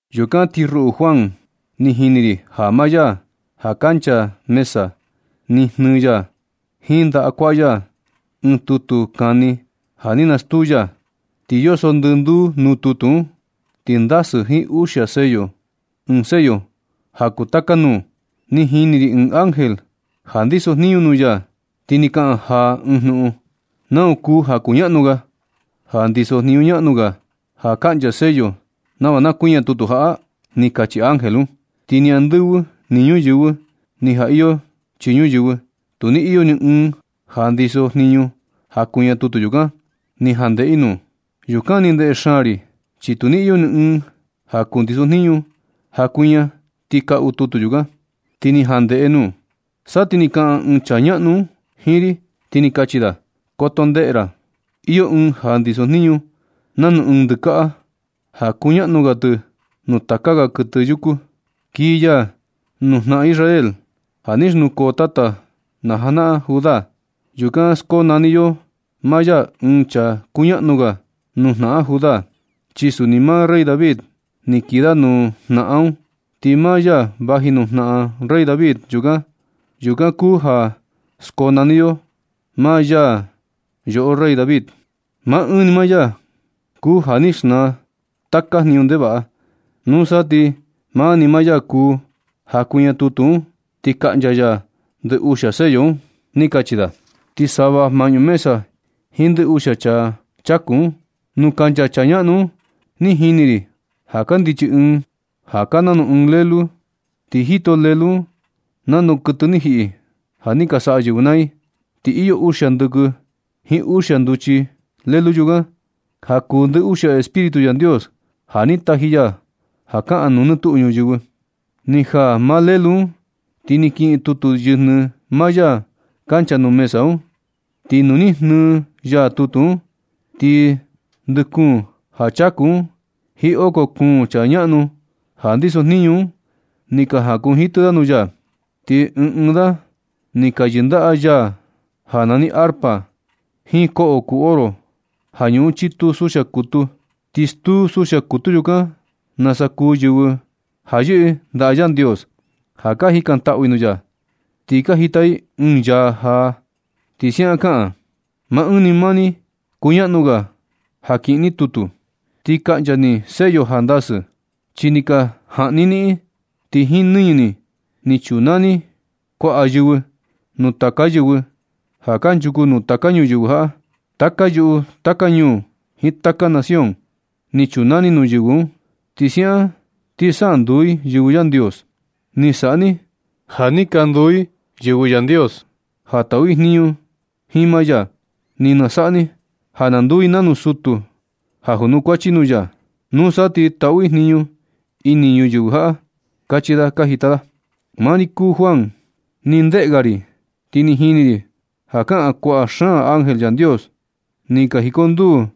Yukan ti ruꞌu Juan, ni jini ri ja maa ya ja kancha mesa, ni jnɨɨ ya jiin ndaꞌa kuaꞌa ya ɨɨn tutu kani ja ni nastuu. Ti yoso ndɨnduu nuu tutu un, ti ndasɨ jiin uxia sello, ɨɨn sello ja kuu taka nuu. Ni jini ri ɨɨn ángel ja ndisojniñu nuu ya, ti ni kaꞌan jaa ɨɨn jnuꞌun: ―¿Nau kuu ja kuñaꞌnu ga, ja ndisojniñu ñaꞌnu ga ja kaꞌncha sello nava na kuiña tutu jaꞌa? ―ni kachi ángel un. Ti ni andɨvɨ, ni ñuyɨvɨ, ni ja iyo chii ñuyɨvɨ, tu ni iyo ni ɨɨn ja ndisojniñu ja kuiña tutu yukan, ni ja ndeꞌe i nuu. Yukan ni ndeꞌe xaan ri chi tu ni iyo ni ɨɨn ja kundisojniñu ja kuiña ti kaꞌu tutu yukan, ti ni ja ndeꞌe nuu. Sa ti ni kaꞌan ɨɨn chaa ñaꞌnu un jiin ri, ti ni kachi da: ―Koto ndeꞌe ra. Iyo ɨɨn ja ndisojniñu nanu ɨɨn ndɨkaꞌa ja kuñaꞌnu ga tɨ nuu taka ga kuɨtɨ yuku. Kii ya nuu jnaꞌan Israel ja ni xnukoo tata najanaꞌan Judá. Yukan skonani yo maa ya ɨɨn chaa kuñaꞌnu ga nuu jnaꞌan Judá. Chi suni maa rey David ni kii da nuu jnaꞌan un, ti maa ya vaji nuu jnaꞌan rey David. Yukan kuu ja skonani yo maa ya yoꞌo rey David. Maa ɨɨn ni maa ya kuu ja ni xnaa taka jniñu ndevaꞌa. Nusa ti maa ni maa ya kuu ja kuiña tutu un ti kaꞌncha ya ndɨ uxia sello un ―ni kachi da. Ti sava maꞌñu mesa jiin ndɨ uxia ja chaku un, nuu kancha chaa ñaꞌnu un, ni jini ri ja kandichi ɨɨn ja kaa nanu ɨɨn lelu. Ti jito Lelu un nanu kuɨtɨ ni jiꞌi ja ni ka saꞌa yɨvɨ naa i. Ti iyo uxia ndɨkɨ jiin uxia nduchi Lelu yukan, ja kuu ndɨ uxia Espíritu Yandios ja ni taji ya ka jaꞌan nuu nɨ tuꞌu ñuyɨvɨ. Ni jaa maa Lelu un ti ni kiꞌin tutu yɨjnɨ maa ya kancha nuu mesa un. Ti nu ni jnɨɨ ya tutu un, ti ndɨ kuun ja chaku un jiin oko kuun chaa ñaꞌnu ja ndisojniñu un ni ka jakunjitɨ da nuu ya. Ti ɨɨn ɨɨn da ni ka yɨndaꞌa yaa ja nani arpa, jiin koꞌo kuu oro, ja ñuꞌun chitu suxia kutu. Ti stuu suxia kutu yukan nasa kuu yɨvɨ ja yɨꞌɨ ndaꞌa Yandios, ja ka jikantaꞌu i nuu ya. Ni ka jita i ɨɨn yaa jaa, ti siaꞌan kaꞌan: Maa ɨɨn ni maa ni kuñaꞌnu ga ja kiꞌin ni tutu ti kaꞌncha ni sello ja ndasɨ. Chi ni ka jaꞌni i niꞌin, ti jiin nɨñɨ ni ni chunaa ni kuaꞌa yɨvɨ nuu taka yɨvɨ ja kanchuku nuu taka ñuyɨvɨ jaꞌa, taka yuꞌu, taka ñuu jiin taka nación. Ni chunaa ni nuu yɨvɨ un, chi siaꞌan ti sa nduu i yɨvɨ Yandios. Ni saꞌa ni ja ni ka nduu i yɨvɨ Yandios ja taꞌu i jniñu jiin maa ya. Ni saꞌa ni ja na nduu i nanu sutu ja kunukuachi nuu ya. Nusa ti taꞌu i jniñu ini ñuyɨvɨ jaꞌa―kachi da ka jita da. Maa ri Juan, ni ndeꞌe ga ri, ti ni jini ri ja kaꞌan kuaꞌa xaan ángel Yandios. Ni ka jikonduu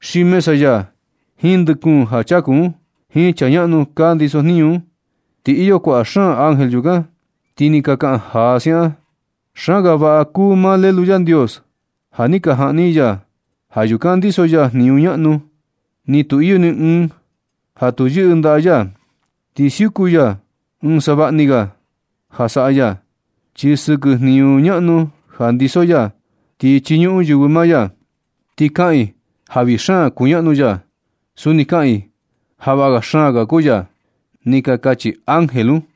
xiin mesa ya jiin ndɨ kuun ja chaku un, jiin chaa ñaꞌnu ka ndisojniñu un. Ti iyo kuaꞌa xaan ángel yukan. Ti ni ka kaꞌan jaa da siaꞌan: Xaan ga vaꞌa kuu maa Lelu Yandios ja ni ka jaꞌni i ya. Ja yukan ndiso ya jniñu ñaꞌnu. Ni tu iyo ni ɨɨn ja tu yɨꞌɨ ndaꞌa ya. Ti siuku ya jiin savaꞌa ni ga ja saꞌa ya. Ja sɨkɨ jniñu ñaꞌnu ja ndiso ya, ti chiñuꞌun yɨvɨ maa ya. Ti kaꞌan i ja vii xaan kuñaꞌnu ya. Suni kaꞌan i ja vaꞌa xaan ga kuu ya. Ni ka kachi ángel un.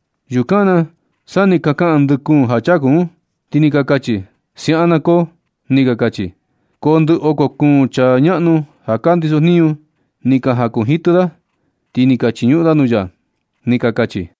Yukan na sa ni ka kaꞌan ndɨ kuun ja chaku un, ti ni ka kachi: ―¡Siaꞌan na koo! ―ni ka kachi. Ti ndɨ oko kuun chaa ñaꞌnu ja ka ndisojniñu ni ka jakunjitɨ da, ti ni ka chiñuꞌun da nuu ya ―ni ka kachi.